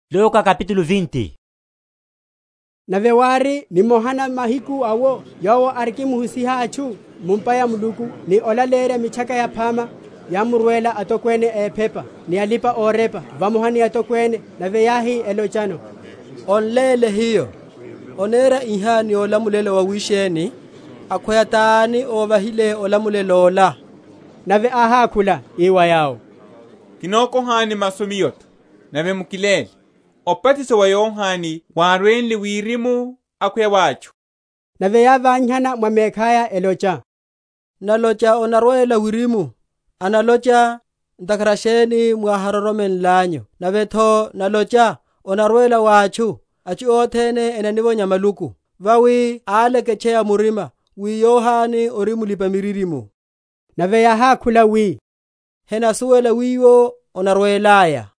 Obatiso wa Yohane. Nave wári nimoha na mahiku awo Yowo arikimuhusiha atchu mu’mpa ya Muluku, ni olaleyerya Mitchaka Yaphama, yámurwela atokwene a ephepa ni alipa‐orepa vamoha ni atokwene; nave yáhi, elochano, On’léle hiyo; onera iha ni olamulelo wawisheni? Akhweya tani óvahile olamulelo ola? Nave áhákhula, ii wa yawo, Kinokohani masu Miyo’tho; nave mukiléle: Obatiso wa Yohane wárwenle wirimu, akhweya wa atchu? Nave yávanyihana mwa mekhaya, elocha, Nalocha onarwela wirimu; analocha, Ntakhara sheni mwahámuroromenlanyu? nave’tho nalocha, Onarwela wa atchu; atchu othene enanivonya maluku: vawi áleketcheya murima, wi Yohane ori mulipa‐miririmo. Nave yáhákhula wi, henasuwela wiwo onarwelaya.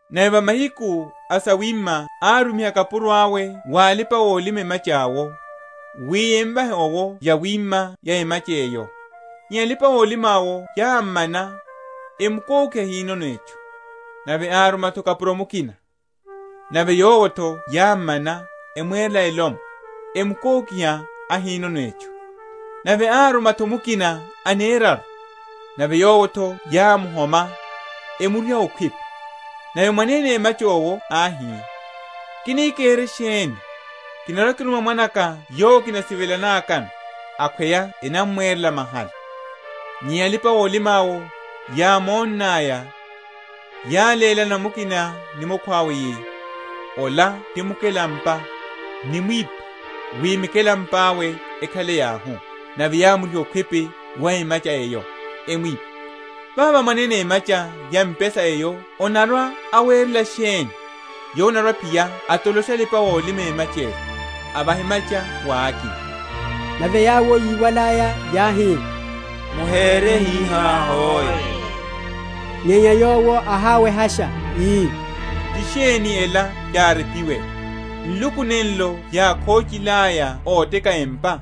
Nave va mahiku a sawima árumiha kapuro awe wa alipa‐olima emacha’wo, wi emvahe’wo yawima ya emacha eyo: nyenya alipa‐olima’wo yámmana, emukokiha ahinono etchu. Nave áruma’tho kapuro mukina: nave yowo’tho yámmana, emwerela elomwe, emukokiha, ahinono etchu. Nave áruma’tho mukina aneraru: nave yowo’tho yámuhoma, emuriha okhwipi. Nave mwanene emacha owo áhi, Kini kere sheni? Kinarwa‐kiruma mwana’ka yowo kinasivelanakano; akhweya enamwerela mahala. Nyenya alipa‐olima’wo, yámonnaya, yálélana mukina ni mukhwawe, yi, Ola ti mukelampa: nimwiphe, wi mikelampa’we ekhale yauhu. Nave yámriha okhwipi wa emacha eyo, emwipha. Vavo mwanene emacha ya mpesa eyo anarwa‐awerela sheni? Yowo anarwa‐aphiya atolosha alipa‐olima emacha’le, avaha emacha wa akina. Nave yawo yíwalaya, yáhi, Muhere hihá hoe! Nyenya Yowo áháwehasha, ii, Ti sheni ela yárepiwe, Nluku nenlo yákhochilaya óteka empa,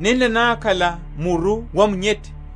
Nenla nákhala muru wa munyethe.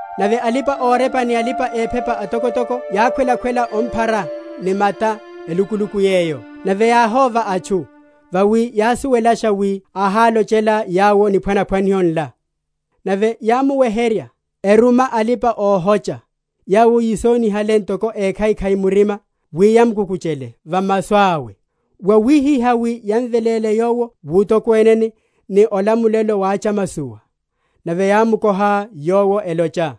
Nave alipa‐orepa ni alipa‐ephepa atokotoko yákhwelasha omphara ni mata elukuluku yeyo; nave yáhóva atchu: vawi yásuwelasha wi áhálochela yawo niphwanaphwaniho nla. Nave yámuweherya, eruma alipa‐ohocha, yawo yisonihale ntoko ékhaikhai‐murima, wi yamukukuchele va masu awe, wawihihá wi yamveléle Yowo wutokweneni, ni olamulelo wa chamasowa. Nave yámukoha Yowo, elocha,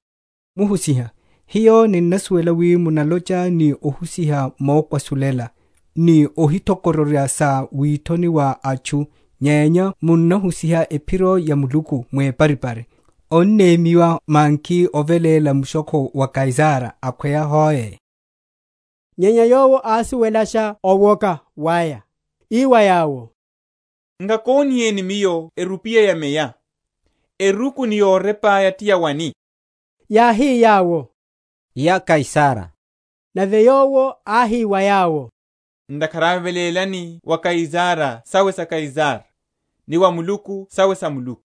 Muhusiha, hiyo ninnasuwela wi munalocha ni ohusiha mokwasulela, ni ohithokororya sa withoni wa atchu, nyenya munahusiha ephiro ya Muluku weparipari: onnemyiwa manki oveléla mushokho wa Kaisara, akhweya hoe? Nyenya Yowo ásuwelasha owoka waya, ii wa yawo, Nkakoniheni Miyo erupiya ya meya. Eruku ni yorepa’ya ti yawani? Yáhi yawo, Ya Kaisara. Nave Yowo áhi wa yawo, Ntakhara awe velélani wa Kaisara sawe sa Kaisara, ni wa Muluku sawe sa Muluku.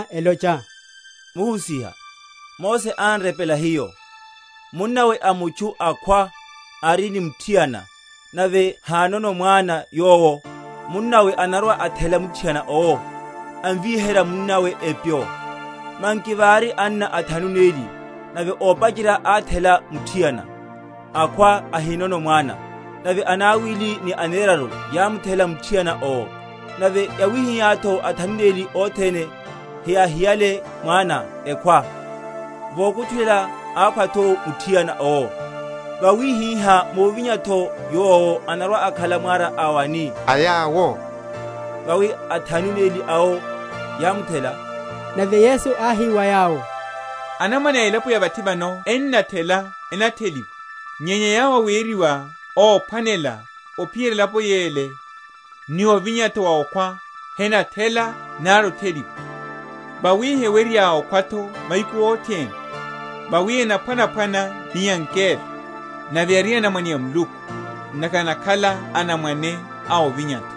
elocha, Muhusiha, Mose án’repela hiyo, munnawe a mutchu akhwa, ari ni muthiana, nave hanono mwana yowo, munnawe anarwa‐athela muthiana owo, amviherye munnawe epyo. Manki vári anna athanu neli: nave ópacherya áthela muthiana, akhwa ahinono mwana; nave anawili, ni aneraru yámuthela muthiana owo; nave yawihihá’tho athanu neli othene, heyáhiyale mwana, ekhwa. Vokutchulela ákhwa’tho muthiana owo. Vawihihá muvinya’tho yowo anarwa‐akhala mwara a wani a yawo? vawi athanu neli awo yámuthela. Nave Yesu áhi wa yawo, Anamwane a elapo ya vathi vano ennathela enatheliwa: nyenya yawo aweriwa óphwanela ophiyerya elapo yele, ni ovinya’tho wa okhwa, henathela nari otheliwa. Vawi hewerya okhwa’tho mahiku othene; vawi enaphwanaphwana ni angelo; nave ari anamwane a Muluku, ntakhara enakhala anamwane a ovinya’tho.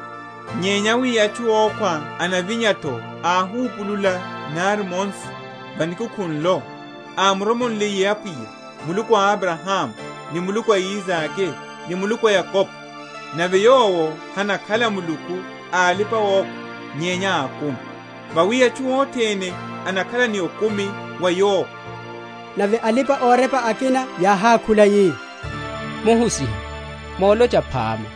Nyenya wi atchu ókhwa enavinya’tho áhupulula nari Mose, va Nikukhu nlo, ámuromonliye Apwiya, Muluku a Abrahamu, ni Muluku a Isake, ni Muluku a Yakobo. Nave Yowo hanakhala Muluku a alipa‐okhwa, nyenya a akumi: vawi atchu othene enakhala ni okumi wa Yowo. Nave alipa‐orepa akina yáhákhula yi, Muhusiha, molocha phama.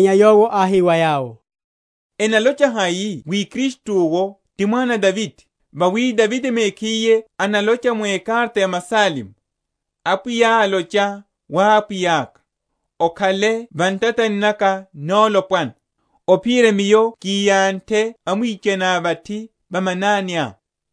Nyenya Yowo áhi wa yawo, Enalocha hai wi Kristu’wo ti mwana a Davide? Vawi Davide mekhiye analocha mu ekarata ya Masalmo, Apwiya álocha wa Apwiya’ka, Okhale va ntatani naka nolopwana, Ophiyerya Miyo kiyanthe amwichaniá vathi va mananiá.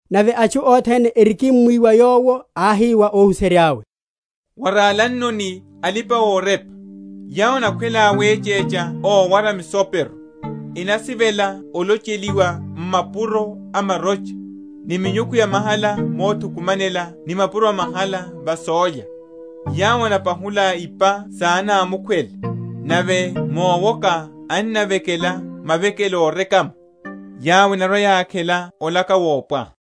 Nave atchu othene erikimmwiwa Yowo, áhi wa óhuserya’we, Waralannoni alipa‐orepa, yawo enakhwela wechecha ówara misopero, enasivela olocheliwa m’mapuro a marocha, ni minyukhu ya mahala mothukumanela ni mapuro a mahala va sólya; yawo enapahula ipa sa anámukhwele, nave mowoka ennavekela mavekelo órekama: yawo enarwa‐yakhela olaka wopwaha.